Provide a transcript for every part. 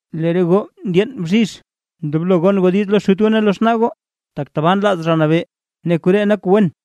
Lee re goo ndyeen bzhizh ndoblo gon goo diiz lo xut goo ne lo xnaa goo, tak tabaa nlaaz Zha Nabee, ne koree nak kuu wen.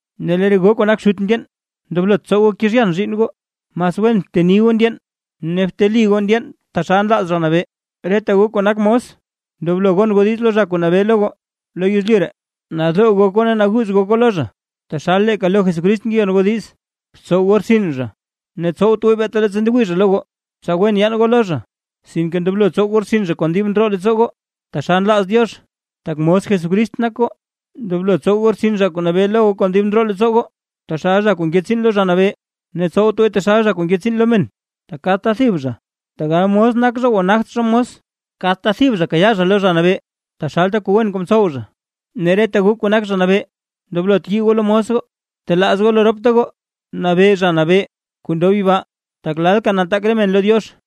Ne lee re goo kuu nak xut ndyeen, ndoblot tsow goo kezhyan zhiinn goo, mas wen bteni goo ndyeen ne bteli goo ndyeen taxal nlaaz Zha Nabee. Reta goo kuu nak mos, ndoblo gon goo diiz lo zha kuu nabee lo goo lo yezlyu ree, nadoo gok goo ne naguuz gok goo lo zha, taxal leeka lo Jesucrist ngeyon goo diiz. Btsow goo rtsin zha ne tsowt gooy beeta leettsa ndewii zha lo goo, tsa wen yaan goo lo zha, sinke ndoblo tsow goo rtsin zha kon dib ndroo leettsoo goo, taxal nlaaz Diox tak mos Jesucrist nak goo. Ndoblo tsow goo rtsin zha kuu nabee lo goo kon dib ndroo leettsoo goo, taxal zha kuu nke tsiin lo Zha Nabee, ne tsowt gooy taxal zha kuu nke tsiin lo men. Tak kadta thib zha, tegal mos nak zha o nagt zha mos, kadta thib zha kayaa zha lo Zha Nabee taxalta kuu wen kuu mtsow zha. Ne reta goo kuu nak zha kuu nabee, ndoblot yii goo lo mos goo, btelaaz goo lo ropta goo nabee Zha Nabee kuu ndob yibaa; tak lalka nataak re men lo Diox.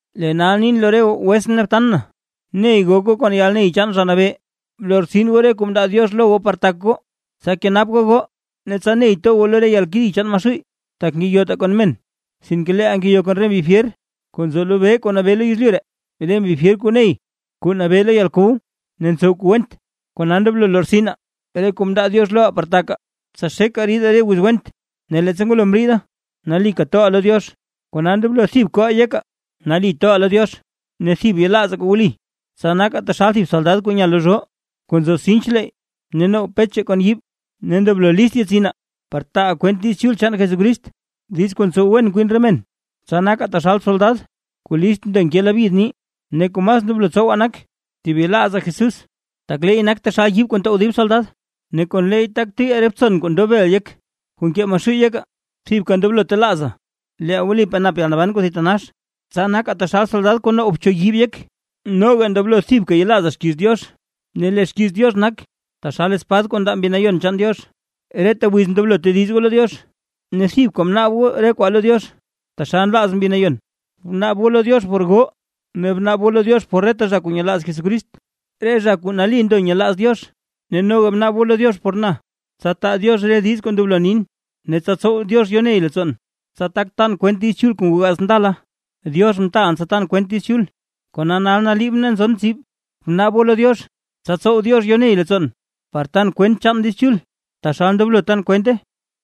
Lee nal nin lo re goo wetsʼn ne btan na, ney gok goo kon yalney chaan Zha Nabee. Blortsin goo re kuu mndaa Diox lo goo par tak goo, tsa tak kenap goo goo ne tsa ney to goo lo re yalkedi chaan Maxuuy. Tak ngeyotaa kon men, sinke leeʼaa ngeyo kon re mbi fyer kuu nzo lobee kuu nabee lo yezlyu ree, re mbi fyer kuu ney kuu nabee lo yalkow ne ntsow kuu went. Kona ndoblo lortsinaa re kuu mndaa Diox loʼaa par takaa, tsa xekaa ridaa re wiz went, ne leettsa ngwalo mriide nalika toʼaa lo Diox. Kona ndoblo thib koʼaa yekaa nali toʼaa lo Diox ne thib yelaazaa kuu wli; tsa nakaa taxal thib soldad kuu nya lo zhoo kuu nzo sinch leeyy ne now pech kon yiib. Ne ndoblo list yetsinaa par taaʼaa kwent Diiz Chul chaan Jesucrist, diiz kuu ntsow wen kwin re men, tsa nakaa taxal soldad kuu list ndo nke labyid ni. Ne kuu mas ndoblo tsowaa nak thib yelaazaa Jesús, tak leey nak taxal yiib kuu ntow dib soldad ne kon leey tak tuyyaa re btson kuu ndob bel yek kuu nkee Maxuuy yekaa. Thibka ndoblo telaazaa leeʼaa wlipaa nap yalnaban kuu thitanax, tsa nakaa taxal soldad kuu now bchuyib yek. Noga ndoblo thibka yelaazaa xkiiz Diox, ne lee xkiiz Diox nak taxal espad kuu ndaa Mbi Nayon chaan Diox. Reta wiz ndoblo tediz goo lo Diox, ne thibka bnaab goo re kwaa lo Diox taxal nlaaz Mbi Nayon, bnaab goo lo Diox por goo ne bnaab goo lo Diox por reta zha kuu nyelaaz Jesucrist, re zha kuu nali ndo nyelaaz Diox. Ne noga bnaab goo lo Diox por na, tsa taa Diox re diiz kuu ndoblo nin, ne tsa tsow Diox yoney leettsoon, tsa tak tan kwent Diiz Chul kuu ngoo gaats ndala. Diox mtaalʼn tsa tan kwent Diiz Chul, kona nal naliibʼn ne nzon tsib. Bnaab goo lo Diox tsa tsow Diox yoney leettsoon, par tan kwent chaan Diiz Chul, taxal ndoblo tan kwente.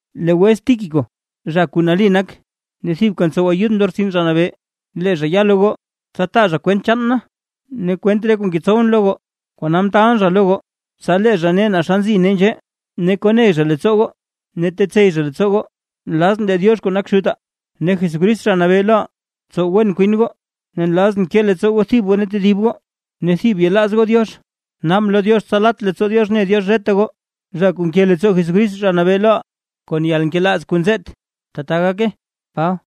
Lee wets Tíquico, zha kuu nali nak ne thibka ntsow ayudʼn lo rtsin Zha Nabee, lee zha ya lo goo, tsa taa zha kwent chaan na ne kwent re kuu ngetsowʼn lo goo. Kona mtaalʼn zha lo goo, tsa lee zha ne lo goo naa xa nzi nee nzhee, ne koney zha leettsoo goo ne tetsey zha leettsoo goo. Nlazʼn lee Diox kuu nak Xutaa, ne Jesucrist Zha Nabee loʼaa tsow wen kwin goo, ne nlazʼn ke leettsoo goo thib goo ne tedib goo ne thib yelaaz goo Diox. Naabʼn lo Diox tsa lat leettsoo Diox ne Diox reta goo, zha kuu nke leettsoo Jesucrist Zha Nabee loʼaa kon yalnkelaaz kuu nzeet. ¡Tbaa gake! Paba